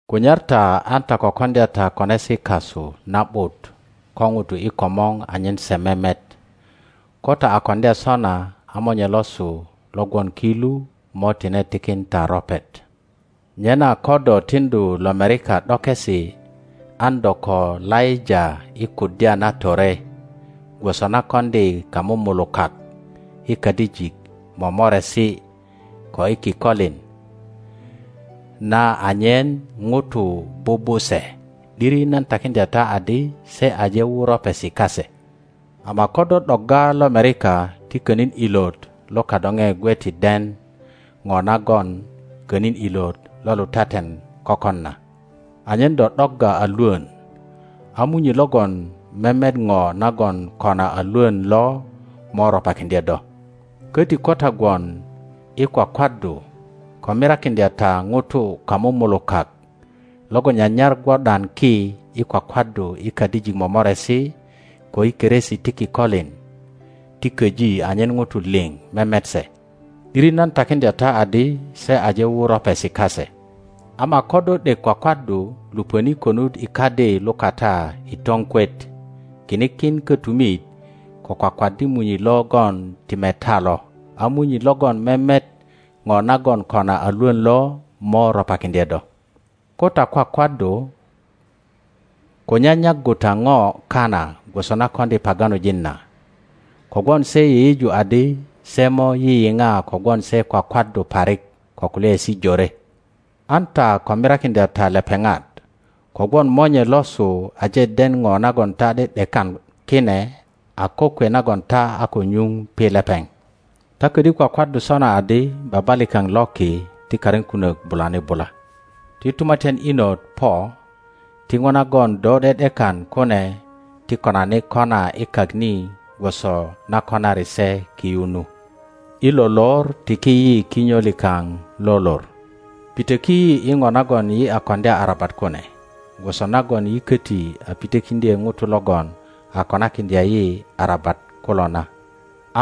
Kunyar ta an ta ko koŋdya takonesi kasu na ’but ko ŋutu i komor anyen se memet; ko ta a koŋdya sona, a Monye losu lo gwon ki lu mo tine tikin ta ropet. Nyena ko do tiŋdu lomerika ’dokesi, an do ko laŋa i kuddya na tore, gwoso na koŋdi kamumulukak i kadijik mo moresi ko i kikolin na anyen ŋutu bubu se. ’Diri nan takiŋdya ta adi se aje wu ropesi kase. Ama ko do ’do’dogga lomerika, ti könin ilot lo kadoŋe gwe ti den ŋo nagon könin ilot lo lutaten kökon na, anyen do ’dogga a lwön; a Munyi logon memet ŋo nagon kona a lwön lo mo ropakiŋdye do. Köti ko ta gwon i kwakwaddu, ko mirakiŋdya ta ŋutu kamumulukak logon nyanyar gwo ’dan ki i kwakwaddu i kadijik momoresi, ko i keresi ti kikolin ti köji anyen ŋutu liŋ memet se. ’Diri nan takiŋdya ta adi se aje wu ropesi kase. Ama ko do ’dek kwakwaddu, lupöni konut i kadi lukata i toŋkwet, kini kin kötumit, ko kwakwaddi Munyi logon ti meta lo; a Munyi logon memet ŋo nagon kona a lwön lo mo ropakiŋdye do. Ko ta kwakwaddu, ko nyanyaggu ta ŋo kana gwoso na koŋdi paganojin na, kogwon se yeyeju adi se mo yiyiŋa kogwon se kwakwaddu parik ko kulyaesi jore. An ta ko mirakiŋdya ta lepeŋat, kogwon Monye losu aje den ŋo nagon ta ’de ’dekan kine a kokwe nagon ta a ko nyuŋ pi lepeŋ. Ta ködyö kwakwaddu sona adi, Baba likaŋ lo ki, Ti karin kunök bulani bula, Ti tumatyan inot po, Ti ŋo nagon do ’de ’dekan kune ti konani kona i kak ni gwoso na konari se ki yu nu. I lo lor tiki yi kinyo likaŋ lo lor; Pitöki yi i ŋo nagon yi a koŋdya arabat kune, gwoso nagon yi köti a pitökiŋdye ŋutu logon a konakiŋdya yi arabat kulo na;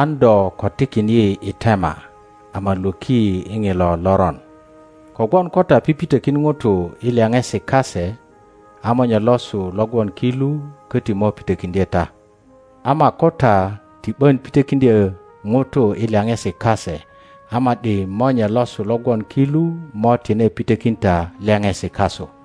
An do ko tikin yi i tema, ama lwöki yi i ŋilo loron. Kogwon ko ta pipitökin ŋutu i lyaŋesi kase, a Monye losu lo gwon ki lu köti mo pitökiŋdye ta; ama ko ta ti ’bön pitökiŋdyö ŋutu i lyaŋesi kase, a ma ’di Monye losu lo gwon ki lu mo tine pitökin ta lyaŋesi kasu.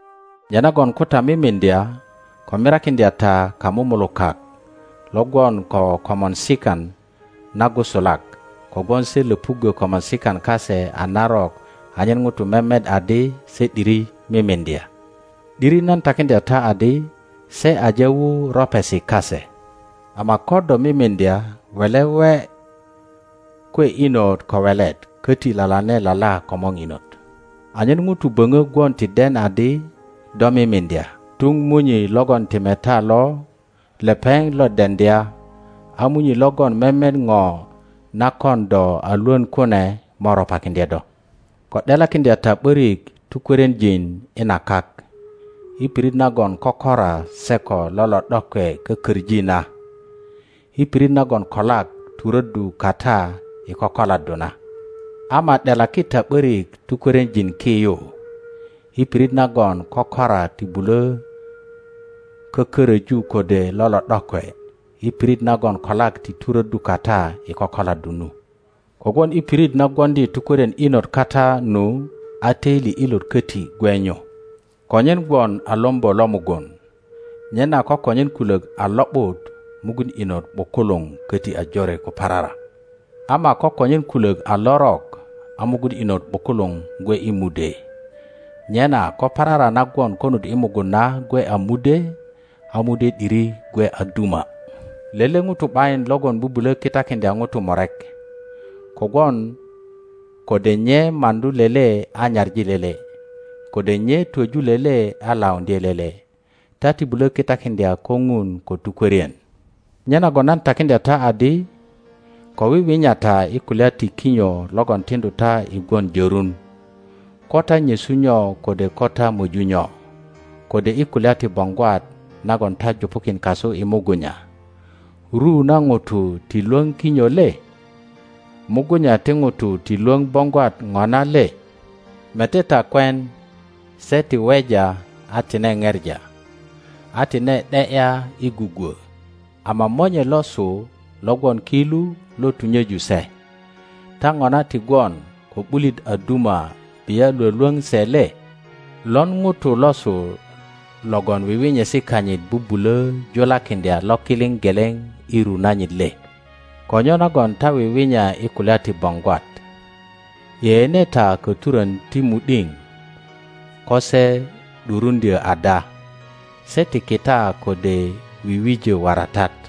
Nyenagon ko ta mimiŋdya, ko mirakiŋdya ta kamumulukak lo gwon ko komorsikan nagusulak, kogwon se löpuggö komorsikan kase a narok anyen ŋutu memet adi se ’diri mimiŋdya. ’Diri nan takiŋdya ta adi se aje wu ropesi kase. Ama ko do mimiŋdya, wele we kwe inot ko welet, köti lalane lala komöŋ inot, anyen ŋutu böŋö gwon ti den adi do mimiŋdya, tuŋ Munyi logon ti meta lo lepeŋ lo deŋdya; a Munyi logon memet ŋo na kon do a lwön kune mö ropakiŋdye do. Ko ’delakiŋdya ta ’börik tukwörienjin i na kak, i pirit nagon kökora se ko lolo ’dokwe kököŋi na, i pirit nagon kolak turöddu kata i kokoladdu na. Ama ’delaki ta ’börik tukwörienjin ki yu, i pirit nagon kökora ti bulö kököröju kode lolo ’dokwe, i pirit nagon kolak ti turöddu kata i kokoladdu nu. Kogwon i pirit na gwoŋdi tukwörien inot kata nu, a töili ilöt köti gwe nyu. Konyen gwon a lombo lo mugun. Nyena ko konyen kulök a lo ’but, mugun inot ’bukuluŋ köti a jore ko parara. Ama ko konyen kulök a lörök, a mugun inöt ’bukuluŋ gwe i mudwe. Nyena ko parara na gwon konut i mugun na gwe a mudwe, a mudwe ’diri gwe a duma! Lele ŋuto ’bayin logon bubulö kitakiŋdya ŋutu murek; kogwon kode nye maŋdu lele a nyaŋi lele, kode nye twöju lele a lauŋdye lele. Ta ti bulö kitakiŋdya kö Ŋun ko tukwörien. Nyenagon nan takiŋdya ta adi, Ko wiwinya ta i kulya ti kinyo logon tiŋdu ta i gwon jörun, ko ta nyesu nyo kode ko ta möju nyo, kode i kulya ti boŋgwat nagon ta jupukin kasu i mugunya. Ru na ŋutu ti lwöŋ kinyo le? Mugunya ti ŋutu ti lwöŋ boŋgwat ŋona le? Mete ta kwen: se ti weja a tine ŋepa, a tine ’de ’ya i gugwö, ama Monye losu lo gwon ki lu lo tunyeju se. Ta ŋona ti gwon ko ’bulit a duma bia lwölwöŋ se le? Loŋ ŋuto losu logon wiwinyesi kanyit bubulö julakiŋdya lokiliŋ geleŋ i ru nanyit le? Ko nyonagon ta wiwinya i kulya ti boŋgwat? Yeyene ta köturön ti mu ’diŋ ko se ’duruŋdyö ada; se ti kita kode wiwöji waratat,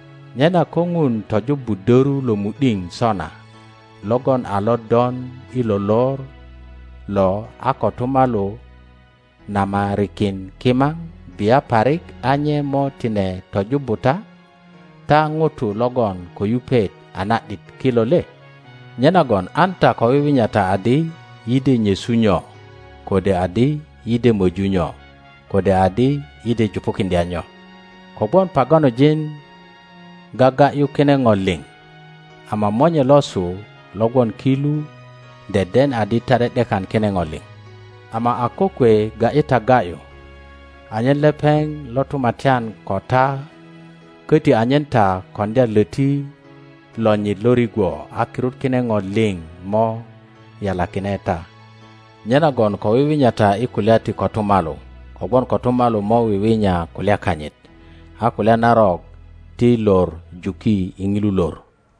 Nyena ko Ŋun tojubbu döru lo mu ’diŋ sona logon a lodon i lo lor lo a kotumalu namarikin kimaŋ, bia parik a nye mo tine tojubbu ta, ta ŋutu logon ko yupet a na ’dit kilo le? Nyenagon an ta ko wiwinya ta adi, Yi de nyesu nyo? kode adi, Yi de möju nyo? kode adi, Yi de jupukiŋdya nyo? Kogwon paganojin gaga ’yu kine ŋo liŋ, ama Monye losu lo gwon ki lu deden adi ta ’de ’dekan kine ŋo liŋ. Ama a kokwe ga ’yi ta ga ’yu anyen lepeŋ lo tumatyan ko ta, köti anyen ta koŋdya löti lonyit lo rigwo, a kirut kine ŋo liŋ mo ’yalakine ta. Nyenagon ko wiwinya ta i kulya ti kotumalu, kogwon kotumalu mo wiwinya kulya kanyit. A kulya narok ti lor juki i ŋilu lor.